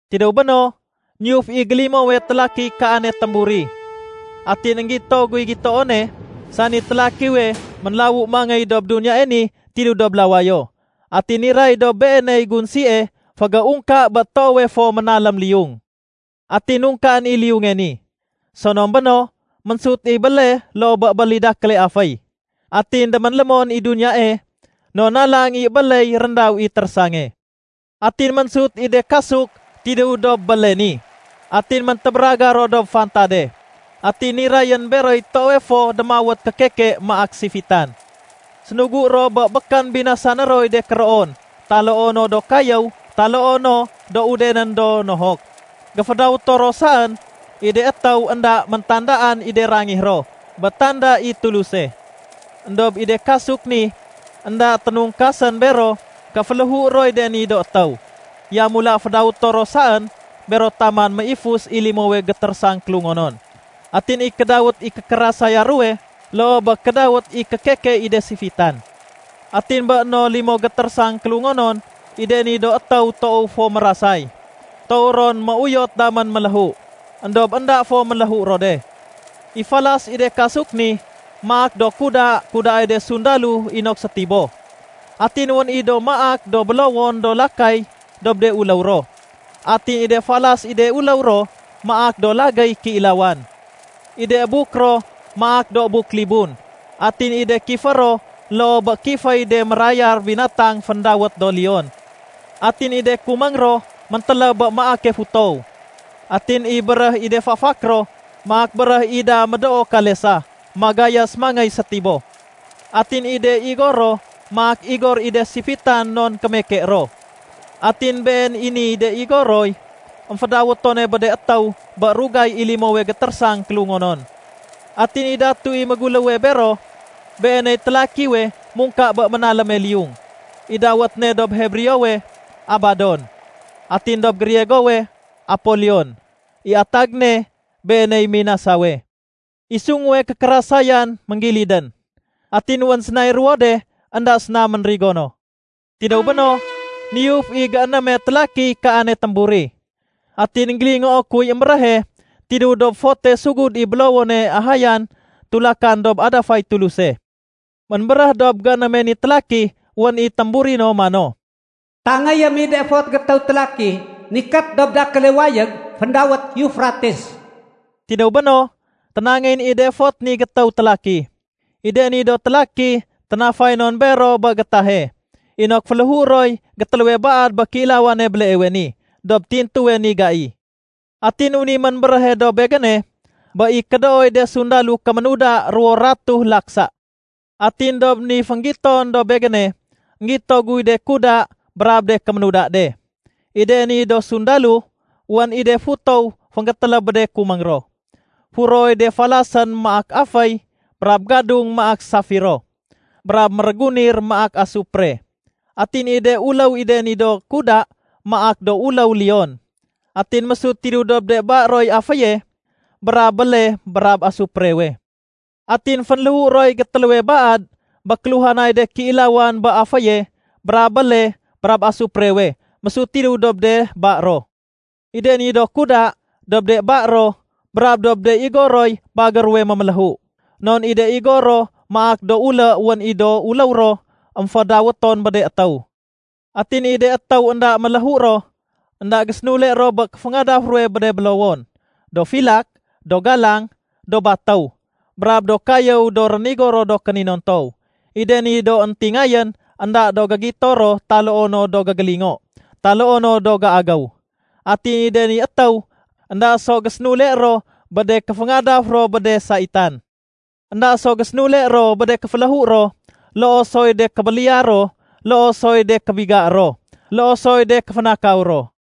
Tidéw béno, niyuf i gélimowe télakiy kaane témburi. Atin énggito guy gitoone, sani télakiwe ménlawu mangéy dob duniyae ni tidéw dob lawayo. Atin niray dob beeney gunsie fégéungka bé toowe fo ménalém liyung. Atin nungkaén i liyunge ni. Sonom béno, ménsut i béle loo bé bél i dakéle aféy. Atin déménlémon i duniyae non nalang i ébéley réndaw i térésange. Atin ménsut i de kasuk tidéw dob béle ni, atin méntébéragar ro dob fantade. Atin nirayén beroy toowe fo démawét kékeke maak sifitan. Sénugu ro bé békén binasané roy de kéroon taloo no do kayéw taloo no do udenén do nohok. Géfédawéto ro saén i de étéw énda méntandaan i de rangih ro bé tanda i Tuluse. Endob i de kasuk ni énda ténungkasén bero ké féléhué roy de ni do étéw. Yamula, fédawéto ro saén bero taman méifus i limowe gétérésang kélungonon. Atin i kédawét i kékérasaya ruwe loo bé kédawét i kékeke i de sifitan. Atin bé no limo gétérésang kélungonon i de ni do étéw toow fo mérasay, toow ron méuyot damén méléhu, éndob énda fo méléhu ro de. I falas i de kasuk ni, maak do kuda kudaay de sundalo inok sétiboh. Atin wén i do maak do bélowon do lakay dob de uléw ro. Atin i de falas i de uléw ro maak do lagéy kéilawan. I de buk ro maak do buk libun. Atin i de kifé ro loo bé kiféy de mérayar binatang féndawét do leon. Atin i de kuméng ro méntéléb bé maake futow. Atin i béréh i de fafak ro maak béréh i da médoo kalesa magayas mangéy sétiboh. Atin i de igor ro maak igor i da sifitan non kémeke ro. Atin been i ni de igor roy émfédawétone bé de étéw bé rugay i limowe gétérésang kélungonon. Atin i datue méguléw bero, beeney télakiwe mungka bé ménaléme liyung. I dawét ne dob Hebreowe “Abadon”, atin dob Griegowe “Apolion”, I atag ne, “Beeney Minasawe”. I sunguwe kékérasayan ménggilidén. Atin wén sénay ruwo de énda séna ménrigo no. Tidéw béno, niyuf i géénéme télakiy kaane témburi. Atin énggélingoo kuy émbéréhe tidéw dob fote sugud i bélowone ahayan tulakan dob adafay Tuluse. Ménbéréh dob géénéme ni télaki wén i témburi no mano, “Tangéyém i de fot gétéw télaki nikét dob dakéle wayég féndawét Eufrates.” Tidéw béno, ténangéyén i de fot ni gétéw télaki. I de ni do télaki ténafay non bero bé gétahe inok féléhué roy gétéléwe baad bé kéilawane béleewe ni dob tintuwe ni gai. Atin wén i ménbéréhe dob begéne bé i kédooy de sundalo kéménuda ruwo ratuh laksa. Atin dob ni fénggiton dob begéne, énggito guy de kuda brab de kéménuda de. I de ni do sundalo, wén i de futow fénggétéléb bé de kuméng ro. Furoy de falasén maak aféy brab gadung maak safiro, brab mérégunir maak asupre. Atin i de uléw i de ni do kuda maak do uléw leon. Atin mésut tidéw dob de ba roy aféye brab béle brab asuprewe. Atin fénléhu roy gétéléwe baad bé kéluhanay de kéilawan bé aféye brab béle brab asuprewe mésut tidéw dob de ba ro. I de ni do kuda, dob de ba ro brab dob de igor roy bagér ruwe méméléhu. Non i de igor ro maak do ulé wén i do uléw ro émfédawéton bé de étéw. Atin i de étéw énda méléhu ro, énda gésénule ro bé kéféngadaf ruwe bé de bélowon, do filak, do galang, do batéw, brab do kayéw do rénigo ro do kéninontow. I de ni do éntingayén énda do gégito ro taloo no do gégélingo taloo no do géagéw. Atin i de ni étéw énda so gésénule ro bé de kéféngadaf ro bé de saitan. Enda so gésénule ro bé de kéféléhu ro, loo soy de kébéliya ro, loo soy de kébigaé ro, loo soy de kéfénakaw ro.